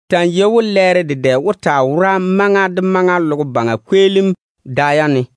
Ta‑n yei we lɛɛro dedɛ wó taa wora maŋa de maŋa logo baŋa kweelim da yam ne.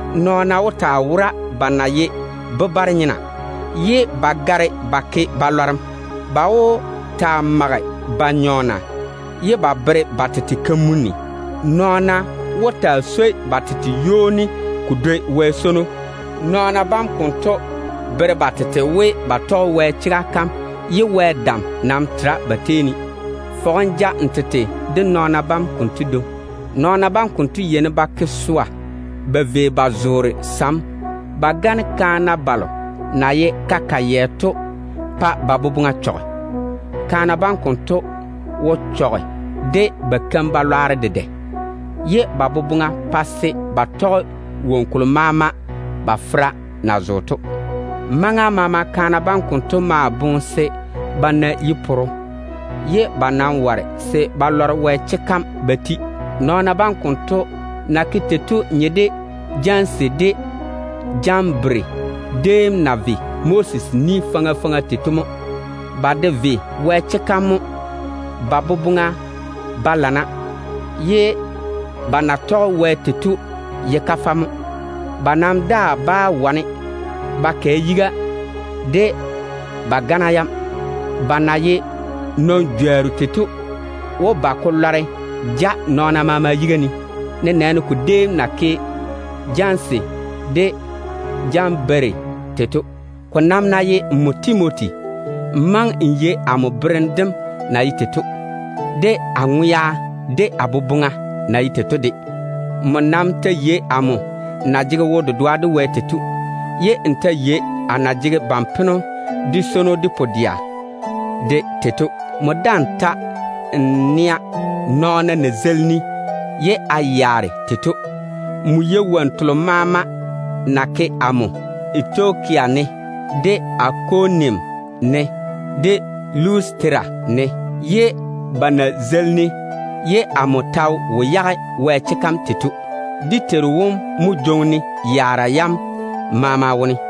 Nɔɔna wó taa wora ba na ye bebare-nyena, ye ba gare ba ke wo-lwanno. Ba wó taa mage ba nyɔɔna ye ba bere ba tete kamunim. Nɔɔna wó taa swoi ba tete ywoni ko dwoi Wɛ swono. Nɔɔna bam konto bere ba tete we ba tɔge Wɛ chega kam, ye Wɛ dam nam tera ba tei ne. Nam lɔŋe nɔɔna bam konto dwoŋi. Nɔɔna bam konto badwonna yeini ba ke swa ba vei ba zoore sam ba gane kaana balo na ye ka-kayɛ to pa ba boboŋa chɔge. Kaana bam konto wo chɔge de ba keim-balwaaro dedɛ, ye ba boboŋa pae se ba tɔge woŋo kolo maama ba fera na zoore to. Maŋa maama kaana bam konto maa boŋa se ba na yi-poro, ye ba nam ware se ba lɔre Wɛ chega kam ba ti. Nɔɔna bam konto na ke tei to nye de Janese de Jambere déem na ve Moses ni faŋa faŋa tei to mo. Ba de ve Wɛ chega kam mo. Ba boboŋa jei mo, ye ba na tɔge Wɛ tei to ye kafɛ. Ba nam daa bá wane ba kɛ yiga de ba gana yam. Ba na ye nɔn-jworru tei to wó ba ko lɔre ja nɔɔna maama yiga ne, nenɛɛne ko déem na ke Janese de Jambere tei to. Ko nam ná ye nmo Timoti, n maŋe n yei amo berem dem na ye tei to, de a totoŋ-naga, de a boboŋa na ye tei to de. Nmo nam ta yei amo na jege wo-dedoa de Wɛ tei to, ye n ta yei a na jege ban-peno, de swono, de pu-dɛa tei to. Nmo ta yei nɔɔna na zeili-ne ye a yaare tei to. Nmo yei wonnu telo maama na ke amo Antioka ne, de Ikonium ne, de Lustera ne, ne ba na zeili-ne ye a ta wo yage Wɛ chega kam tei to. Dé Teiru wom nam mo jwoŋi-ne yaara yam konto maama wone.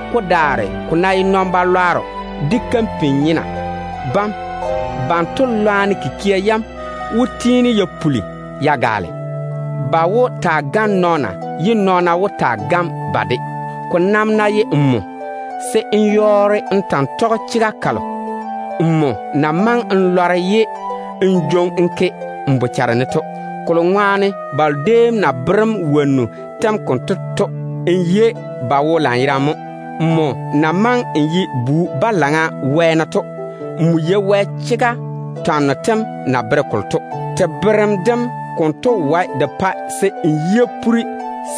Ko daare ko ná ye nɔn-balwaaro de kampin-nyena, banto keim-lwanno tem wó tiini te puli te gaale. Ba wó taa gane nɔɔna, ye nɔɔna wó taa gane ba de. Ko nam ná ye nmo, se n yɔɔre n ta‑n tɔge chega kalo nmo na maŋe n lɔre ye n jwoŋi-ka n ke n boboŋa ne to, kolo ŋwaane balo déem na bere‑m wonnu tem konto to, n yei ba wo lanyerane mo. Nmo na maŋe n ye bu-balaŋa wɛɛne to, nmo yei Wɛ chega twanno tem na bere kolo to. Te berem dem konto wae de pae se n yi poora,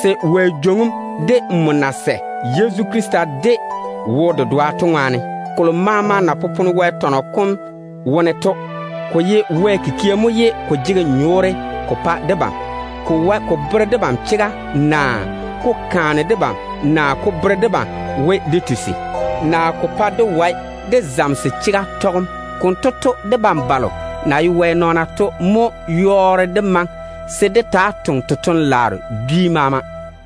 se Wɛ jwoŋi‑m o yage, nmo na sɛ Yezu Krista de wo-dedoa to ŋwaane. Kolo maama na popone Wɛ tɔnɔ kom wone to, ko ye Wɛ kikia mo ye ko jege nyɔɔre ko pa debam. Ko wae ko bere debam chega, naa ko kaane debam, naa ko pae dé na koresem, naa ko pae dé wae dé zamese chega tɔgem. Konto to, debam balo na ye Wɛ nɔɔna to mo yɔɔre dé maŋe se dé taa toŋe totoŋ-laaro dwi maama.